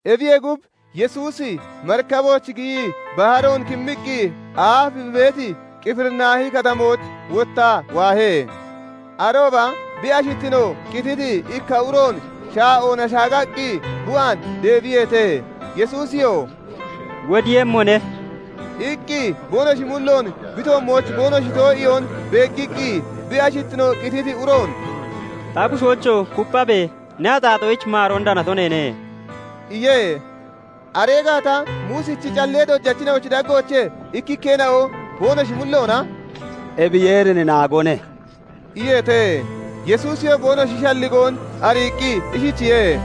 Ebiyee gub, Yesuusi marikabooch giyii baharoon kimmiqqi aaf bi beeti Qifirinaahi Katamooch wottaa waahe. Arooba bi ashittino qititi ikka uroon shaa'oona shaagaqqi bi waan deebiyeete. Yesuusiyoo "Wodiiyemmone" iqqi boonoshi mulloon bi toommooch boonoshi too'iyoon beeggiqqi, bi ashittino qititi uroon "Ta bushoocho! Kupphabe! Ne axaaxoyich maaroon danato neene" iye. Aree gaata Muusichi callee dojachina'ochi daggoochee ikkikkeena'o boonoshi mulloona "Ebi Yeerin naagone" iyeete. Yesuusiyoo boonoshi shalligoon ariiqqi ishichiye:-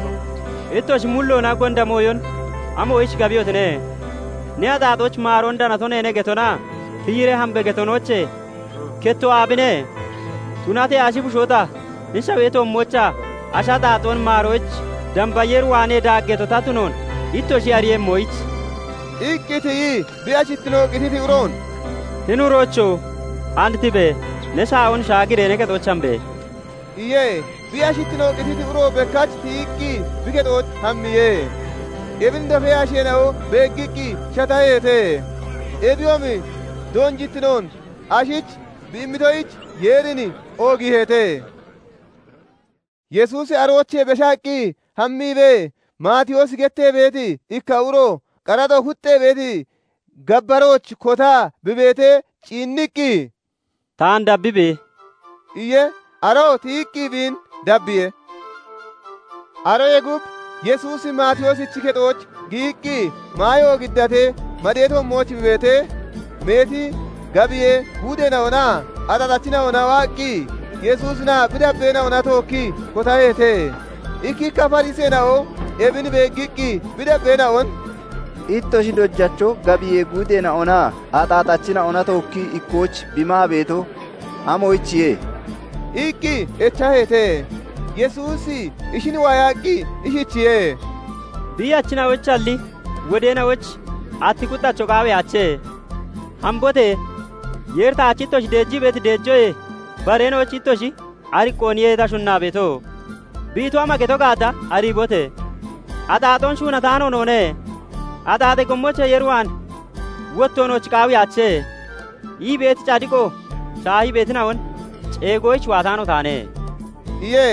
"Ittoshi mulloona gonda mooyon amoyich gabiyotine? 'Ne axaaxoyich maaroon danato neene' getonaa 'Tiyiree hambe!' getonoochee kettoo aabine? Tunatee ashi bushoo ta hini shawee toommoochaa ashi axaaxoon maaroyich, damba Yeer waanee daaggeeto ta tunoon ittoshi ariiyemmoyich..." iqqi tiyii bi ashittino qititi uroon "Hini uroocho! And tibe! Ne shaa'oon shaagiree ne kexooch hambe!" iye. Bi ashittino qititi uroo bekkach tiyiqqi bi kexooch hammiye. Ebin dofee asheena'o beeggiqqi shataheete; ebiyoomi doonjittinoon ashich bi immitoyich Yeerin oogiiheete. Yesuusi aroochee beshaqqi hammiibee Maatiyoosi gettee beeti ikka uro qaraxo kuxxee beeti gabbarooch kotaa bi beetee ciinniqqi, "Taan dabbibe!" iye. Aroo tiyiqqi biin dabbiye. Aroyee gub, Yesuusi Maatiyoosichi kexooch giyiqqi maayo giddatee madee toommooch bi beetee, meeti gabiyee guudeena'onaa axaaxachina'ona waaqqi Yesuusinaa bi dabbeena'ona tookkii kotaheete. Ikkikka Fariseena'o ebin beeggiqqi bi dabbeena'on "Ittoshi dojacho gabiyee guudeena'onaa axaaxachina'ona tookkii ikkooch bi maa beeto amoyichiye?" iqqi echaheete. Yesuusi ishin waayaqqi ishichiye:- "Biiyachina'oyichalli wodeena'oyich atti kuxxacho qaawiyaache. Hambote! Yeeri 'Taach ittoshi deejii beeti deejoyee bareena'oyich ittoshi ariqqooniye ta shunnaa beeto' bi ito ama geto gaata ariibote! 'Axaaxoon shuunataano noone; axaaxee gommoochee Yeer waan wotto nooch qaawiyaache' ii beeti cadiqo shaahii beetina'on ceegoyich waataano taane" iye.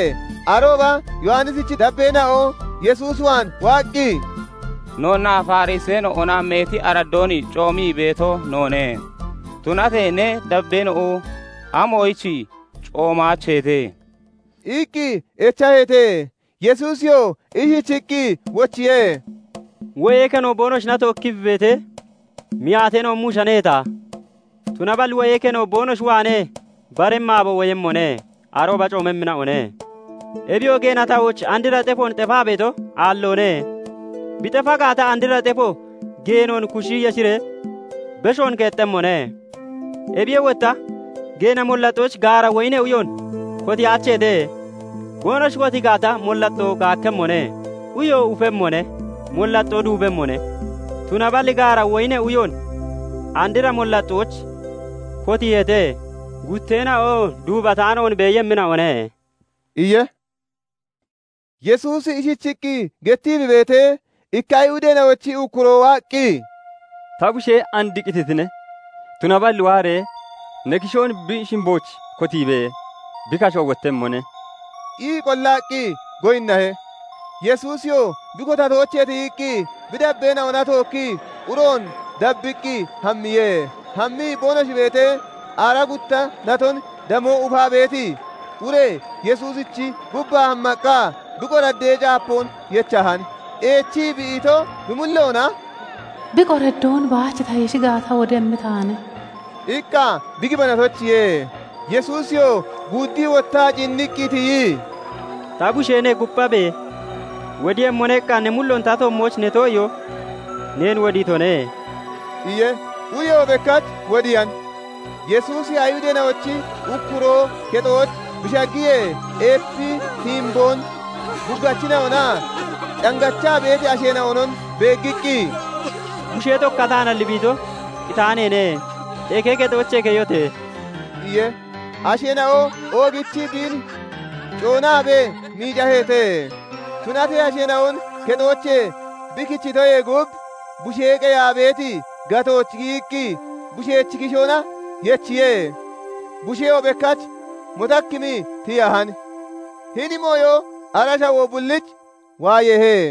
Arooba Yowannisichi dabbeena'o Yesuus waan waaqqi, "Noonnaa Fariseena'ona [meeti araddoon] coomii beeto noone; tunatee ne dabbeena'o amoyich coomaacheete?" iqqi echaheete. Yesuusiyoo ishichiqqi wochiye; "Wo'ee keno boonoshina tookkii beetee, miyaateena'o muushaneheeta? Tunaballi wo'ee keno boonoshi waanee baremmi aabo woyemmone; arooba coomemmina'one. "Ebiyoo geena tahooch andra xefoon xefaa beeto aalloone; bi xefa gaata, andra xefo geenoon kushi yeshiree beshoon keexxemmone. Ebiyee wotta geena mollaxxooch gaara woyinee uyoon kotiyaacheete. Boonoshi kotii gaata, mollaxxoon gaakkemmone; uyo ufemmone; mollaxxoo duubemmone. Tunaballi gaara woyinee uyoon andra mollaxxooch kotiiheete; gutteena'oo duubataanoon beeyemmina'one" iye. Yesuusi ishichiqqi gettii bi beetee, ikka Ayihudeena'ochi ukkuroo waaqqi, "Ta bushee and qititine; tunaballi waaree ne kishoon bi shimbooch kotiibe! Bi kashoo wottemmone" ii qollaqqi goyinnahe. Yesuusiyoo bi kotatoochee tiyiqqi bi dabbeena'ona tookkii uroon dabbiqqi hammiye. Hammii boonoshi beetee, aaraa gutta naton damoo ufaa beeti ure Yesuusichi gubbaa hammaqqa bi qoraddee caapoon yechahan. Eechii bi ito, bi mulloona "Bi qoraddoon baach ta yeshi gaata, wodemmi taane" iqqa bi gibanatoyichiye. Yesuusiyoo guuddii wottaa ciinniqqi tiyii, "Ta busheene! Kupphabe! 'Wodiiyemmone' iqqa ne mulloon ta toommooch ne too'iyoo neen wodiitone" iye. Ureyoo bekkach wodiyan. Yesuusi Ayihudeena'ochi ukkuroo kexooch bi shaggiyee, eepi tiimboon huggachina'onaa cangachaa beeti asheena'onon beeggiqqi, "Bushee tokkataanalli bi ito, qitaaneene. Eke kexoochee keyote!" iye. Asheena'o oogichii biin coonaabee miicaheete. Tunatee asheena'on kexoochee bi kichitoyee gub, bushee qeyaa beeti gatooch giyiqqi bushechi kishoona yechiye; busheyoo bekkach motakkimii tiyahan. Hini mooyo ara shawoo bulliich waayeehe.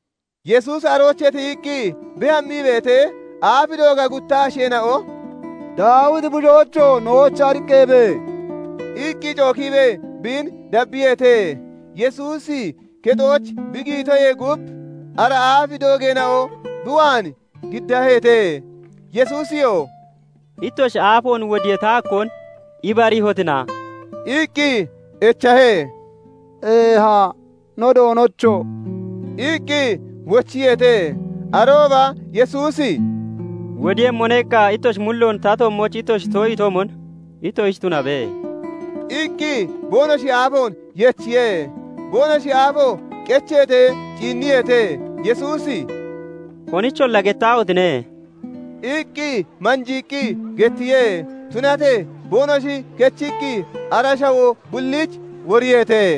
Yesuusi aroochee tiyiqqi bi hammii beetee, aaf dooga gutta asheena'o "Daawiti bushoocho! Nooch ariqqabe!" iqqi cookiibee biin dabbiyeete. Yesuusi kexooch bi giyitoyee gub ara aaf doogeena'o bi waan giddaheete. Yesuusiyoo "Ittoshi aafoon wodiyee ta hakkoon ibariihotina?" iqqi echahe. "Eeha, no Doonocho!" iqqi wochiyeete. Arooba Yesuusi " 'Wodiiyemmone' iqqa ittoshi mulloon ta toommooch ittoshi too'itoomon ittoshich tunabe" iqqi boonoshi aafoon yechiye. Boonoshi aafoo qecheetee ciinniyeete. Yesuusi "Konicholla gettaahotine!" iqqi manjiiqqi gettiye. Tunatee boonoshi kechiqqi ara shawoo bulliich woriyeete.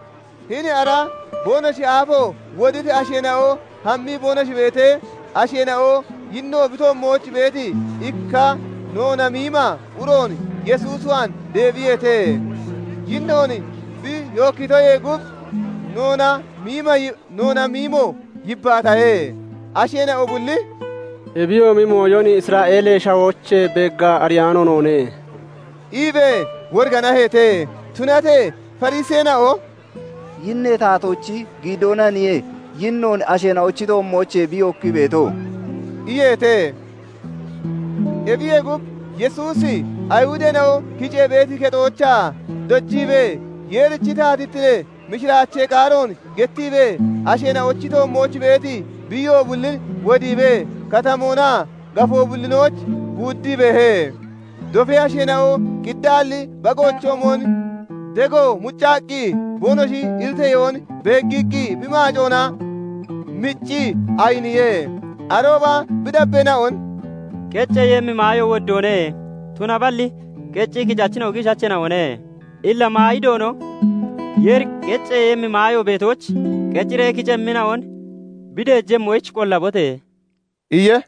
Hini ara boonoshi aafo woditi asheena'o hammii boonoshi beetee, asheena'o yinno bi toommooch beeti ikka noona miima uroon Yesuus waan deebiyeete. Yinnoon bi yookkitoyee gub noona miimo yibbaatahe. Asheena'o bulli "Ebiyoomi mooyon Isra'eelee Shawoochee beeggaa ariyaano noone" iibee woriganaheete. Tunatee Fariseena'o "Yinnee taatoochi giidoonaniye yinnoon asheena'ochi toommoochee bi yookkii beeto" iyeete. Ebiyee gub, Yesuusi Ayihudeena'o kicee beeti kexoochaa dojiibee, Yeerichi taatittinee mishiraachee qaaroon gettiibee, asheena'ochi toommooch beeti biiyo bullin wodiibee, katamoonaa gafoo bullinooch guuddii beehe. Dofee asheena'o qiddaalli bagoochoomon dego muccaqqi boonoshi iriteyoon beeggiqqi bi maacoona mccii ayiniye. Arooba bi dabbeena'on "Qecceeyemmi maayo woddoone; tunaballi qecii kicachina'o giishacheena'one. Illa maayi Doono Yeeri qecceeyemmi maayo beetooch qeciree kicemmina'on bi deejemmoyich qollabote!" iye.